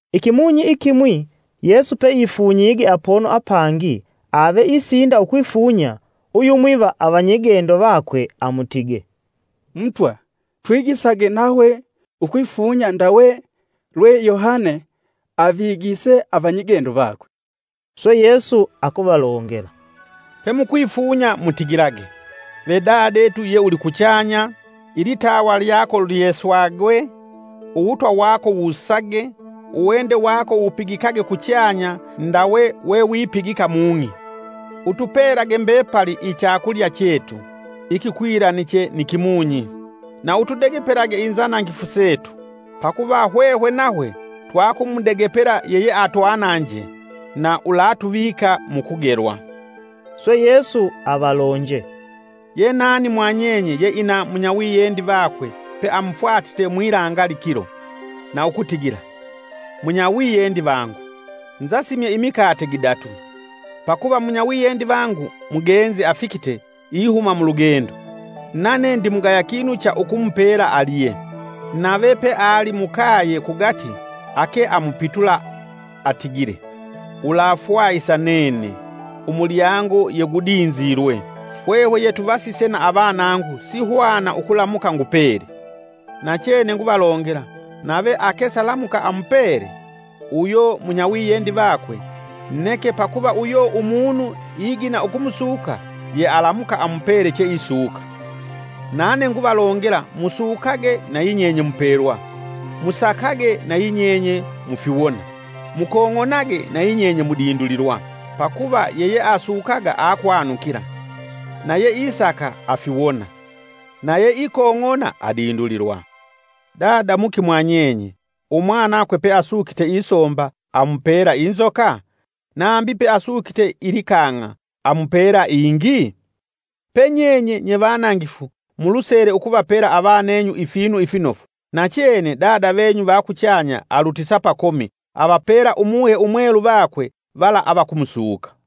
Ikimunyi ikimwi, Yesu peifunyige apono apangi ave isinda ukwifunya, uyumwi va avanyigendo vakwe amutige, “Mutwa, twigisage nahwe ukwifunya ndawe lwe Yohane avigise avanyigendo vakwe,” Swe Yesu akuvalongela, “Pemukwifunya mutigilage: ‘Ve Dadetu ye Ulikuchanya! Ilitawa lyako lyeswagwe; Uwutwa wako wusage. Uwende wako wupigikage kuchanya Ndawe wewipigika mung'i. Utupelage mbepali ichakulya chetu, ikikwilaniche ni kimunyi. Na utudegepelage inzanangifu setu, Pakuva hwehwe nahwe twakumudegepela yeyeatwananje; Na ulatuvika mukugelwa.’” Swe Yesu avalonje, “Ye nani mwa nyenye yeina munyawiyendi vakwe peamufwatite mwilangali kilo, na ukutigila: ‘Munyawiyendi vangu, nzasimye imikate gidatu, pakuva munyawiyendi vangu mugenzi afikite ihuma mulugendo, nane ndimugaya kinu cha ukumupela alye.’ Nave peali mukaye kugati ake amupitula atigile: ‘Ulafwahisa nene! Umulyango yegudinzilwe. Hwehwe yetuvasise na avanangu sihwana ukulamuka ngupele!’ Nachene nguvalongela nave ake salamuka amupele, uyo munyawiyendi vakwe, neke pakuva uyo umunu igina ukumusuka, yealamuka amupele cheisuka. Nane nguvalongela, musukage, nayinyenye mupelwa, musakage, nayinyenye mufiwona, mukong'onage, nayinyenye mudindulilwa. Pakuva yeyeasukaga akwanukila, na yeisaka afiwona, na yeikong'ona adindulilwa. Dada muki mwa nyenye, umwanakwe peasukite isomba, amupela inzoka? Nambi peasukite ilikang'a, amupela ingii? Pe nyenye, nyevanangifu, mulusele ukuvapela avanenyu ifinu ifinofu. Nachene Dada venyu va kuchanya alutisa pakomi, avapela Umuhe Umwelu vakwe vala avakumusuka.”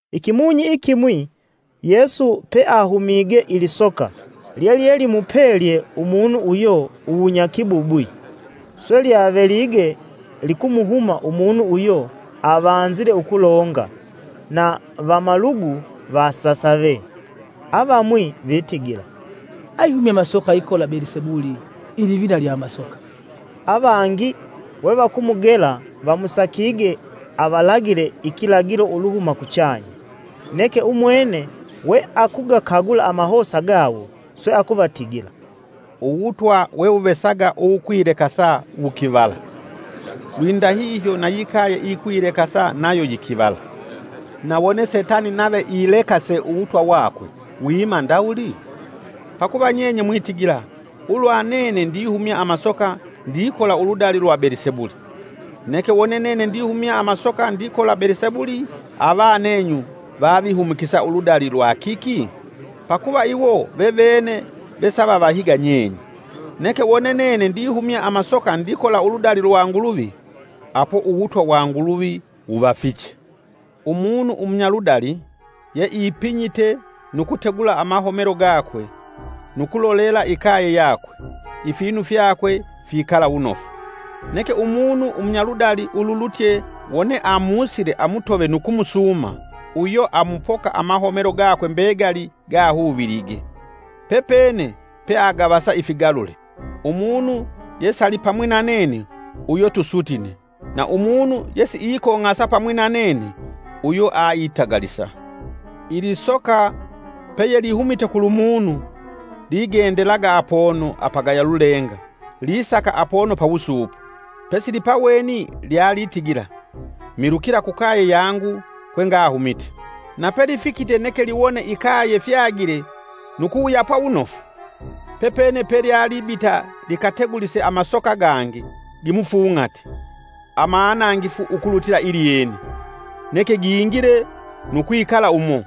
Ikimunyi ikimwi, Yesu peahumige ilisoka lyelyelimupelye umunu uyo uwunyakibubwi. Swe lyavelige likumuhuma umunu uyo avanzile ukulonga, na vamalugu vasasave. Avamwi vitigila, “Aihumya amasoka ikola Belisebuli ilivina lya amasoka.” Avangi, we vakumugela, vamusakige avalagile ikilagilo uluhuma kuchanya. Neke umwene we akugakagula amahosa gawo, Swe akuvatigila, “Uwutwa wewuvesaga uwukwilekase wukivala, lwindahihyo na yikaye iyikwilekasa nayo yikivala. Na wone setani nave alekase uwutwa wakwe, wima ndawuli? Pakuva nyenye mwitigila, ulwa nene ndihumya amasoka ndikola uludali lwa Belisebuli. Neke wone nene ndihumya amasoka ndikola Belisebuli avanenyu vavihumikisa uludali lwa kiki? Pakuva iwo vevene vesavavahiga nyenye. Neke wone nene ndihumya amasoka ndikola uludali lwa Nguluvi, apo uwutwa wa Nguluvi wuvafiche. “Umunu umunyaludali, yeipinyite nu kutegula amahomelo gakwe, nu ukulolela ikaye yakwe, ifinu fyakwe fikala wunofu; Neke umunu umunyaludali ululutye wone amusile amutove nu kumusuuma, uyo amupoka amahomelo gakwe mbegali gahuvilige, pepene peagavasa ifigalule. Umunu yesalipamwi na nene uyo tusutine, na umunu yesiikong'asa pamwi na nene uyo aitagalisa. “Ilisoka peyelihumite kulumunu, ligendelaga apono apagaya lulenga lisaka apono pawusuupo, pesilipaweni lyalitigila, ‘Milukila kukaye yangu kwengahumite.’ Na pelifikite neke liwone ikaye fyagile nu kuwuyapwa wunofu. Pepene pelyalibita likategulise amasoka gangi gimufung'ati amanangifu ukulutila ilyene, neke gingile nu kwikala umo.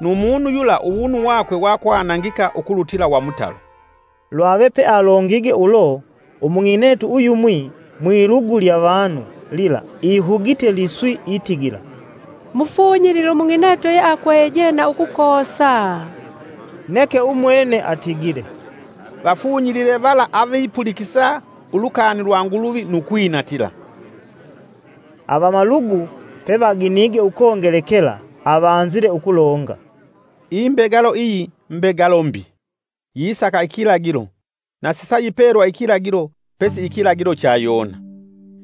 Nu munu yula uwunu wakwe wakwanangika ukulutila wa mutalo.” Lwave pealongige ulo, umung'inetu uyumwi mwilugu lya vanu lila ihugite liswi itigila, “Mufunyilile umung'inetu yakweje na ukukoosa!” Neke atigile, “Vafunyilile vala avipulikisa ulukani lwa Nguluvi nu kwinatila.” Avamalugu pevaginige ukongelekela, avanzile ukulonga, “Imbegalo iyi mbegalo mbi, yisaka ikilagilo. Na sisayipelwa ikilagilo pesi ikilagilo cha Yona.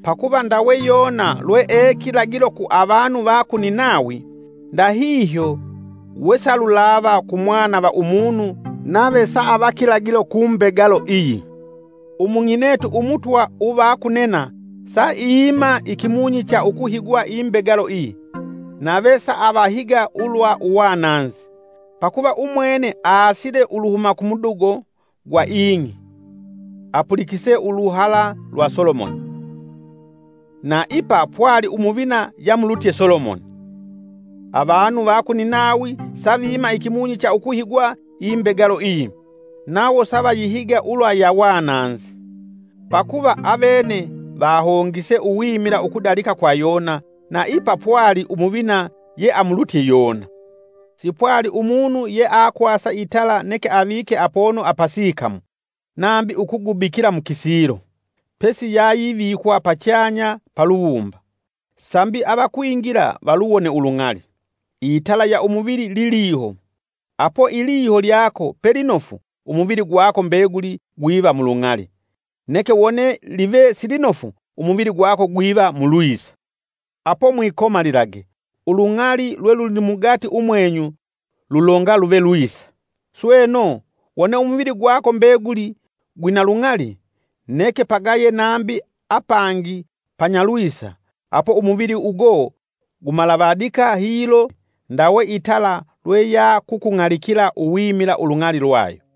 Pakuva ndawe Yona, lwee kilagilo ku avanu va ku Ninawi, ndahihyo wesalulava ku Mwana va Umunu nave saava kilagilo ku mbegalo iyi. Umung'inetu umutwa uva ku nena saiima ikimunyi cha ukuhigwa imbegalo iyi, nave saavahiga ulwa uwananzi. Pakuva umwene aasile uluhuma kumudugo gwa ing'i apulikise uluhala lwa Solomoni, na ipa pwali umuvina yamulutye Solomoni. Avanu va ku Ninawi savima ikimunyi cha ukuhigwa imbegalo iyi nawo savayihiga ulwa ya wananzi. Pakuva avene vahongise uwimila ukudalika kwa Yona, na ipa pwali umuvina yeamulutye Yona. “Sipwali umunu yeakwasa itala neke avike apono apasikamu, nambi ukugubikila mukisilo, pesi yayivikwa pachanya paluwumba, sambi avakwingila valuwone ulung'ali. Itala ya umuvili liliho apo iliho lyako pelinofu umuvili gwako mbeguli gwiva mulung'ali; neke wone live silinofu umuvili gwako gwiva mulwisa. Apo mwikomalilage, ulung'ali lwelulimugati umwenyu lulonga luve lwisa. Sweno, wone umuvili gwako mbeguli, gwina lung'ali, neke pagaye nambi apangi panyalwisa, apo umuvili ugo gumalavadika hilo ndawe itala lweyakukung'alikila uwimila ulung'ali lwayo.”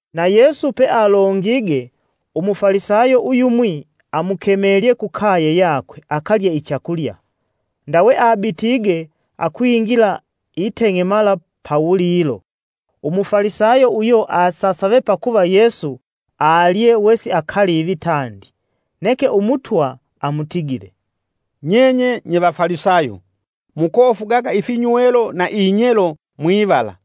Na Yesu pealongige umufalisayo uyumwi amukemelye kukaye yakwe akalye ichakulya, ndawe abitige akwingila iteng'emala pawulilo. Umufalisayo uyo asasave pakuva Yesu alye wesiakalivi tandi. Neke Umutwa amutigile, “Nyenye nye vafalisayo mukofugaga ifinywelo na inyelo mwivala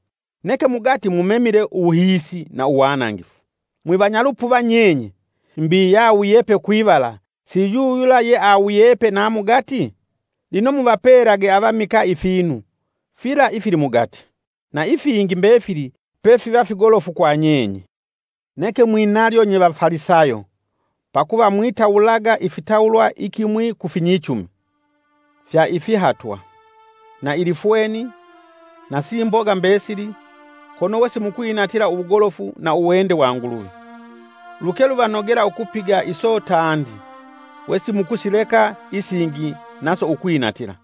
neke mugati mumemile uwuhiisi na uwanangifu. Mwivanya lupuva nyenye! Mbi yawuyepe kwivala si yuyula yeawuyepe na mugati? Lino muvapelage avamikaa ifinu fila ifili mugati, na ifingi mbefili pefiva figolofu kwa nyenye. “Neke mwinalyo nye Vafalisayo, pakuva mwitawulaga ifitawulwa ikimwi ku finyichumi, fya ifihatwa, na ilifweni na simboga mbesili kono wesimukwinatila uwugolofu na uwende wa Nguluvi. Lukeluvanogela ukupiga iso tandi, wesikumuleka isingi naso ukwinatila.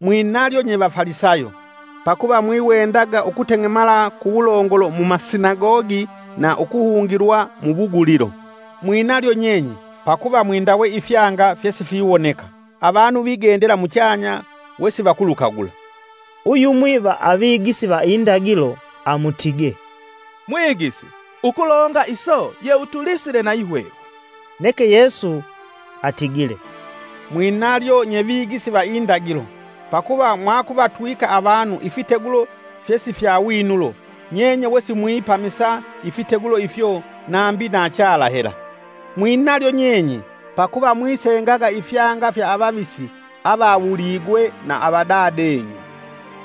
“Mwinalyo nye Vafalisayo, pakuva mwiwendaga ukuteng'emala kuwulongolo mumasinagogi na ukuhungilwa mu wugulilo. Mwinalyo nyenye, pakuva mwindawe ifyanga fyesifiwoneka, avanu vigendela muchanya wesivakulukagula.” Uyumwi va avigisi va indagilo amutige, “Mwigisi, ukulonga iso yeutulisile nayi hwehwe.” Neke Yesu atigile, “Mwinalyo nye Vigisi va indagilo, pakuva mwakuvatwika avanu ifitegulo fyesifyawinulo, nyenye wesimwipamisa ifitegulo ifyo nambi na chala hela. Mwinalyo nyenye, pakuva mwisengaga ifyanga fya avavisi avawuligwe na avadadenyu.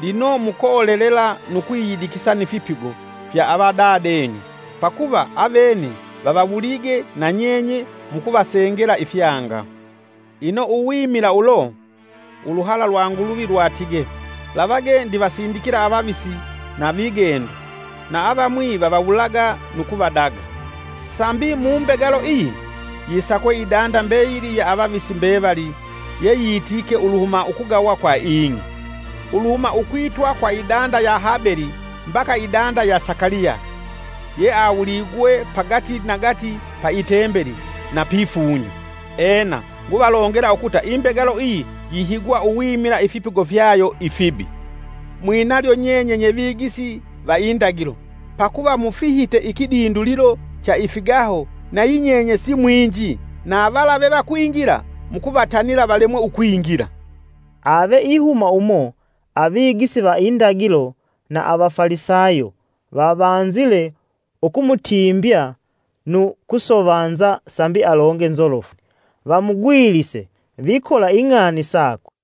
Lino mukolelela nu kwiyidikisa ni fipigo fya avadadenyu, pakuva avene vavawulige na nyenye mukuvasengela ifyanga. Ino uwimila ulo, Uluhala lwa Nguluvi lwatige: ‘Lavage ndivasindikila avavisi na vigendo, na avamwi vavawulaga nu kuvadaga.’ Sambi mu mbegalo iyi, yisakwe idanda mbeyili ya avavisi mbevali yeyitike uluhuma ukugawa kwa ing'i, uluhuma ukwitwa kwa idanda ya Habeli mbaka idanda ya Sakaliya, yeawuligwe pagati nagati pa itembeli na pifunyo. Ena, nguvalongela ukuta imbegalo iyi yihigwa uwimila ifipigo fyayo ifibi. “Mwinalyo nyenye nye vigisi va indagilo, pakuva mufihite ikidindulilo cha ifigaho nayinyenye simwinji na vala vevakwingila mukuvatanila valemwe ukwingila.” Ave ihuma umo, avigisi va indagilo na avafalisayo vavanzile ukumutimbya nu kusovanza sambi alonge nzolofu, Vamugwilise vikola ing'ani sakwe.